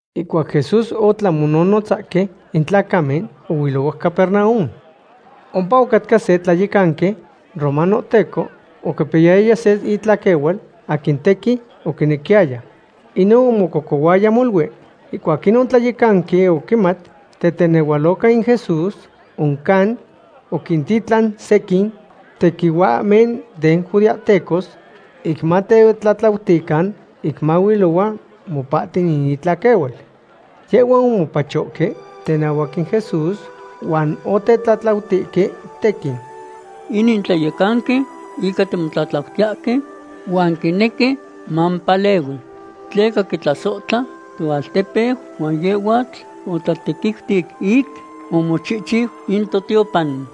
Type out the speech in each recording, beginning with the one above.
Ihcuac Jesús otlan mononotzahque in tlacamen, ohuilohuac Capernaum. Ompa ocatca se tlayecanqui romanohteco oquipiyaya se itlaquehual aquin tequin oquinequiyaya. Inon omococohuaya molui. Ihcuac inon tlayecanqui oquimat tetenehualoca in Jesús, oncan oquintitlan sequin tequihuahmen den judeahtecos ic matetlatlautican ic mahuilohua mopahti in itlaquehual. Yehhuan omopachohque tenahuac in Jesús huan otetlatlautihque tequin: ―Inin tlayecanqui ica timotlatlautiyahque huan quinequi mamopalehui. Tleca quitlasohtla toaltepeu huan yehhuatl otlatequiuti ic omochihchiu in totiopan.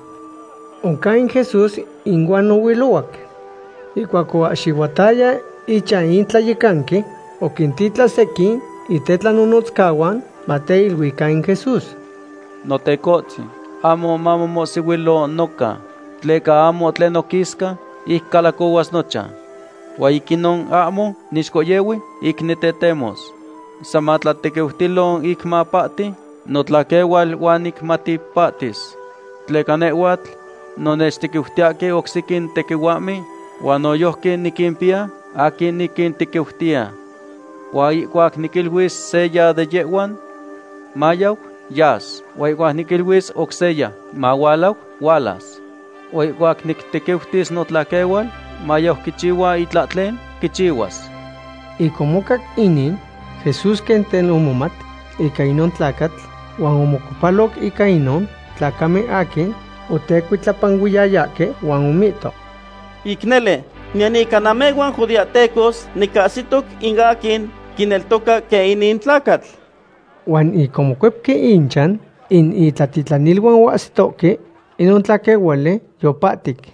Oncan Jesús inuan ohuilohuac. Ihcuac oahxihuataya ichan in tlayecanqui, oquintitlan sequin itenonotzcahuan mateiluican in Jesús: ―Notecohtzin, ahmo mamomohsihuilo noca, tleca ahmo tlen noquisca ic calacohuas nochan. Huan ic inon ahmo nixcohyehui ic nitetemos. San matlatequiutilo ic mapahti notlaquehual huan nicmati pahtis. Tleca nehhuatl no nechtequiutiyahque oc sequin tequihuahmen huan noyojqui niquimpiya aquin niquintequiutiya. Huan ihcuac niquiluis seya de yehhuan: “Mayau”, yas; huan ihcuac niquiluis oc seya: “Mahualau”, hualas. Huan ihcuac nictequiutis notlaquehual mayau quichihua itlahtlen, quichihuas. Ic omocac inin, Jesús quen tel omomat ica inon tlacatl huan omocuepaloc ica inon tlacamen aquin otecuitlapanuiyayahque huan omihto: ―Ic nele, niyan ica namehhuan judeahtecos nicahsitoc in aquin quineltoca quen inin tlacatl. Huan ic omocuepque ichan, in itlatitlaniluan ocahsitohque inon tlaquehuali yipahtic.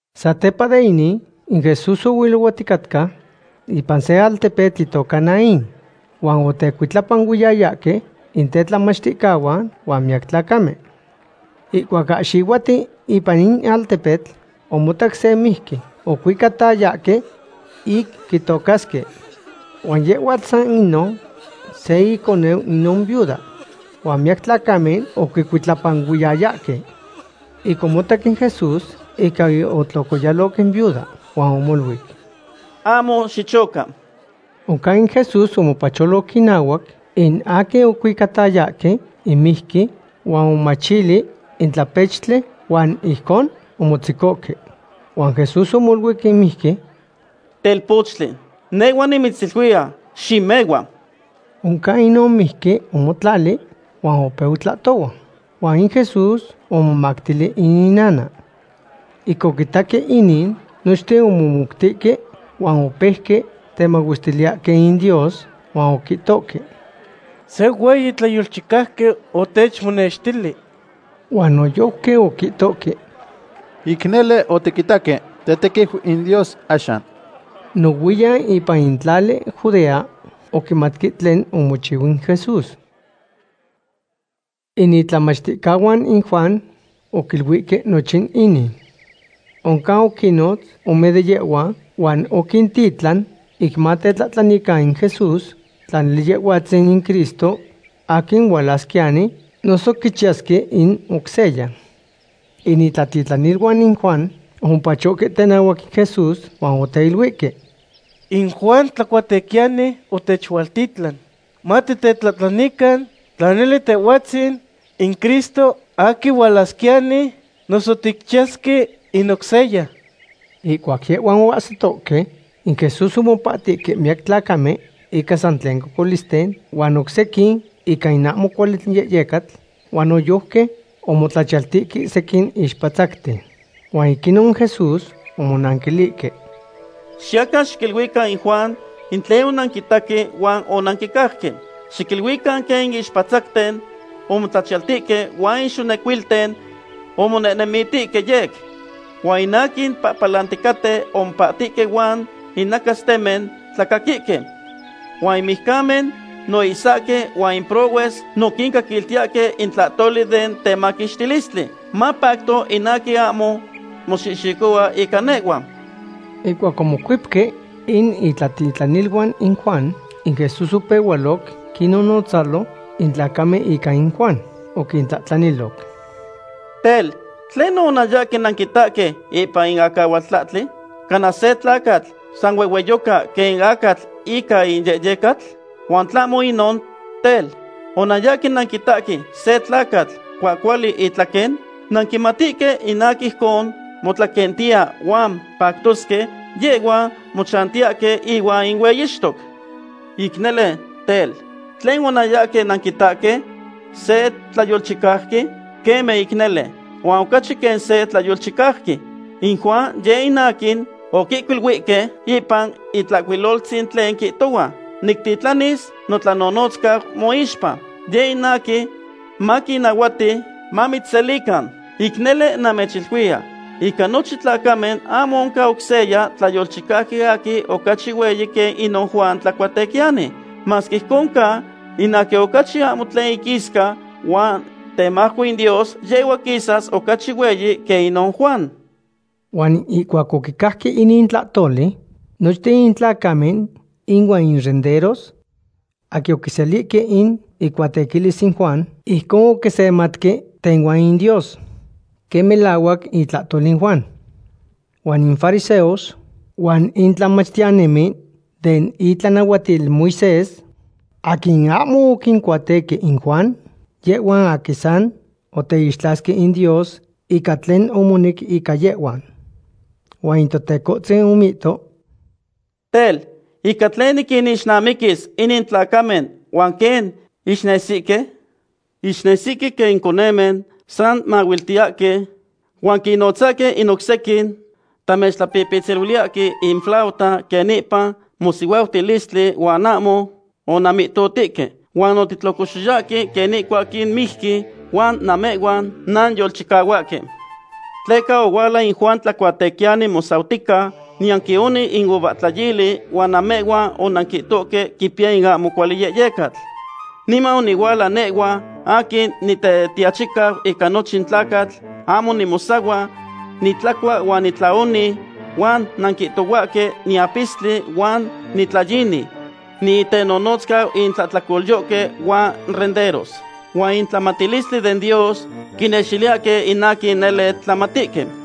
Satepa de inin, in Jesús ohuilohuaticatca ipan se altepetl itoca Naín, huan otecuitlapanuiyayahque in tetlamachticahuan huan miyac tlacamen. Ihcuac ahxihuatiu ipan in altepetl, omotac se mijqui ocuicatayahque ic quitocasque. Huan yehhuatl san inon se iconeu inon viuda. Huan miyac tlacamen oquicuitlapanuiyayahque. Ic omotac in Jesús, ica otlocoyaloc in viuda huan omoluic: ―Ahmo xichoca. Oncan in Jesús omopacholoc inahuac in aquin ocuicatayahque in mijqui huan omomachili in tlapechtli huan ijcon omotzecohque. Huan Jesús omoluic in mijqui: ―Telpochtli, nehhua nimitziluiya; ¡Ximehua! Oncan inon mijqui omotlali huan opeu tlahtohua. Huan in Jesús omomactili in inana. Ic oquitaque inin, nochten omomoutihque huan opeuque temahuestiliyahque in Dios huan oquihtohque: ―Se hueyi tlayolchicauqui otechmonextili. Huan noyojqui oquihtohque: ―Ic nele otiquitaque tetequiu in Dios axan. Nohuiyan ipan in tlali Judea oquimatque tlen omochiu in Jesús. In itlamachticahuan in Juan oquiluihque nochin inin. Oncan oquinnotz ome de yehhuan, huan oquintitlan ic matetlahtlanican in Jesús tla nele Yehhuatzin in Cristo aquin hualasquiyani noso quichiyasque in oc seya. In itlatitlaniluan in Juan omopachohque tenahuac in Jesús huan oteiluihque: ―In Juan Tlacuatequiyani otechualtitlan matitetlahtlanican tla nele Tehhuatzin in Cristo aquin hualasquiyani, noso ticchiyasque in oc seya. Ihcuac yehhuan oahsitohque, in Jesús omopahtihque miyac tlacamen ica san tlen cocolisten, huan oc sequin ica in ahmo cuali yehyecatl. Huan noyojqui omotlachiyaltihque sequin ixpatzacten. Huan ic inon in Jesús omonanquilihque: ―Xiyacan xiquiluican in Juan in tlen onanquitaque huan onanquicajque. Xiquiluican quen in ixpatzacten omotlachiyaltihque huan in xonecuilten omonehnemiltihque yec. Huan in aquin pahpalanihque opahtihque huan in nacastemen tlacaquihque. Huan in mijcamen no oihsahque huan in prohues no quincaquiltiyahque in tlahtoli den temaquixtilistli. Mapacto in aquin ahmo moxihxicohua ica nehhua. Ihcuac omocuepque in itlatitlaniluan in Juan, in Jesús opehualoc quinnonotzalo in tlacamen ica in Juan. Oquintlahtlaniloc: ―Tel, ¿tlenon onanyahque nanquitaque ipan in acahualtlahtli? ¿Cana se tlacatl sa huehueyoca quen in acatl ica in yehyecatl? Huan tlahmo inon tel, ¿onanyahque nanquitaque se tlacatl cuahcuali itlaquen? Nanquimatihque in aquin ijcon motlaquentiya huan pactosque, yehhuan mochantiyahque ihuan in hueyixtoc. Ic nele, tel, ¿tlen onanyahque nanquitaque? ¿Se tlayolchicauqui? Queme ic nele, huan ocachi quen se tlayolchicauqui. In Juan yeh in aquin oquihcuiluihque ipan Itlahcuiloltzin tlen quihtohua: Nictitlanis notlanonotzcau moixpa. Yeh in aquin maquinnahuati mamitzselican. Ic nele, namechiluiya, ica nochin tlacamen ahmo oncan oc se tlayolchicauqui aquin ocachi hueyi quen inon Juan Tlacuatequiyani. Masque ijcon ca, in aquin ocachi ahmo tlen iquisca huan temajco in Dios, yehhua quisas ocachi hueyi quen inon Juan. Huan ihcuac oquicajque inin tlahtoli, nochten in tlacamen ihuan in renderos aquin oquiselihque in icuatequilis in Juan ijcon oquisematque tehuan in Dios quen melahuac itlahtol in Juan. Huan in fariseos huan in tlamachtiyanimen den itlanahuatil Moisés aquin ahmo oquincuatequi in Juan, yehhuan aquin san oteixtlasque in Dios ica tlen omonec ica yehhuan. Huan in Totecohtzin omihto: ―Tel, ¿ica tlen niquinixnamiquis inin tlacamen huan quen ixnesihque? Ixnesihque quen in conemen san mahuiltiyahque huan quinnotzahque in oc sequin: “Tamechpipitziliyahque in flauta quen ipan mosihuautilistli huan ahmo onanmihtotihque. Huan otitlocoxtoyahque quen ica in mijqui huan namehhuan nanyolchicahuahque.” Tleca ohuala in Juan Tlacuatequiyani mosautica, niyan quioni in uvahtlayili, huan namehhuan onanquihtohque quipiya in ahmo cuali yehyecatl. Niman onihuala nehhua aquin Nitetiachicau ica nochin tlacatl, ahmo nimosahua, nitlacua huan nitlaoni, huan nanquihtohuahque niapistli huan nitlayini, niitenonotzcau in tlahtlacolyohque huan renderos. Huan in tlamatilistli den Dios quinextiliyahque in aquin nele tlamatihque.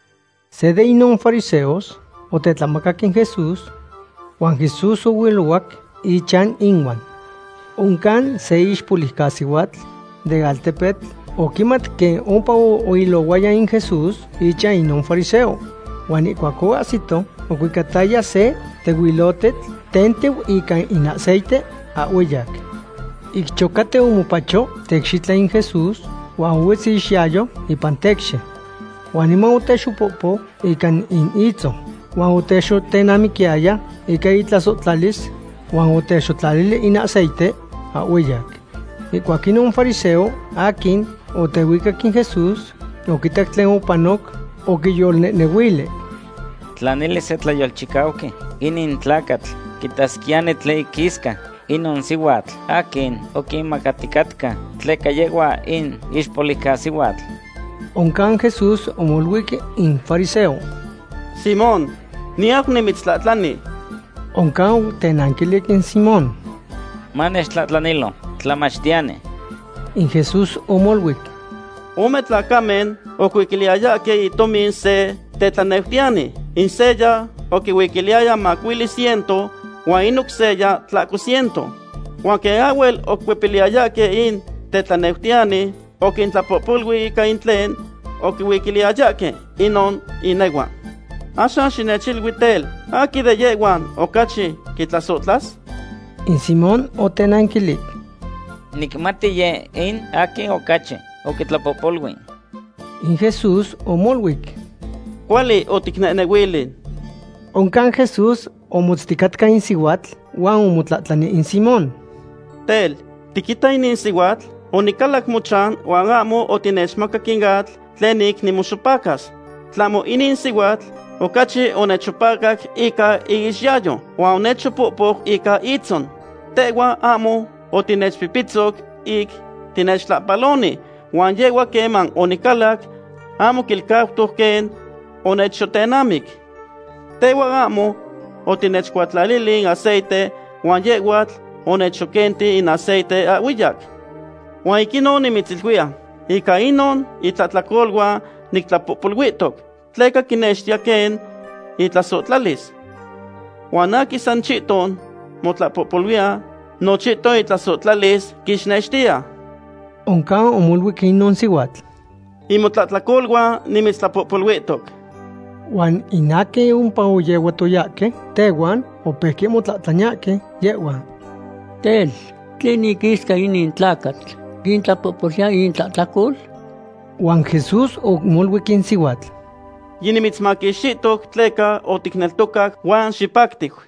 Se de inon fariseos otetlamacac in Jesús, huan Jesús ohuilohua ichan ihuan. Oncan se ixpoliucasihuatl den altepetl oquimat quen ompa ilohuaya in Jesús ichan inon fariseo. Huan ihcuac oahsito ocuicataya se tehuilotetl tentiu ica in aceite ahhueyac. Ic chocatiu omopacho teicxitla in Jesús huan ohuetz iixyayo ipan tecxi. Huan niman otexopohpou ica in itzon, huan otexotenamiquiyaya ica itlasohtlalis huan otexotlalili in aceite ahhueyac. Ihcuac inon fariseo aquin otehuicac in Jesús oquitac tlen opanoc, oquiyolnehnehuili: “Tla nele se tlayolchicauqui inin tlacatl, quitasquiyani tlen iquisca inon sihuatl aquin oquimacaticatca, tleca yehhua in ixpoliucasihuatl.” Oncan Jesús omoluic in fariseo: ―Simón, niyau nimitztlahtlani. Oncan otenanquilic in Simón: ―Manechtlahtlanilo, tlamachtiyani. In Jesús omoluic: ―Ome tlacamen oquihuiquiliyayahque in tomin se tetlaneutiyani. In seya oquihuiquiliyaya macuili ciento huan in oc seya tlahco ciento. Huan quen ahhuel oquicuepiliyayahque in tetlaneutiyani, oquintlapohpolui ica in tlen oquihuiquiliyayahque inon inehuan. Axan xinechilui tel, ¿aquin de yehhuan ocachi quitlasohtlas? In Simón otenanquilic: ―Nicmati yeh in aquin ocachi oquitlapohpolui. In Jesús omoluic: ―Cuali oticnehnehuili. Oncan Jesús omotzticatca in sihuatl huan omotlahtlani in Simón: ―Tel, ¿tiquita inin sihuatl? Onicalac mochan huan ahmo otinechmacac in atl tlen ic nimoxopacas. Tlahmo inin sihuatl ocachi onechxopacac ica iixyayo, huan onechxopohpou ica itzon. Tehhua ahmo otinechpipitzo ic tinechtlahpaloni, huan yehhua, queman onicalac, ahmo quilcautoc quen onechxotenamic. Tehhua ahmo otinechcuatlalili in aceite huan yehhuatl onechxoquenti in aceite ahhueyac. Huan ic inon nimitziluiya, ica inon itlahtlacoluan nictlapohpoluihtoc, tleca quinextiya quen itlasohtlalis. Huan aquin san chihton motlapohpoluiya no chihton itlasohtlalis quixnextiya. Oncan omoluic inon sihuatl: ―In motlahtlacoluan nimitztlapohpoluihtoc. Huan in aquin ompa oyehuatoyahque tehuan opeuque motlahtlaniyahque yehhuan: ―Tel, ¿tlen iquisca inin tlacatl, quintlapohpoluiya intlahtlacol? Huan Jesús omoluic in sihuatl: ―Yinimitzmaquixtihtoc tleca oticneltocac huan xipactiu.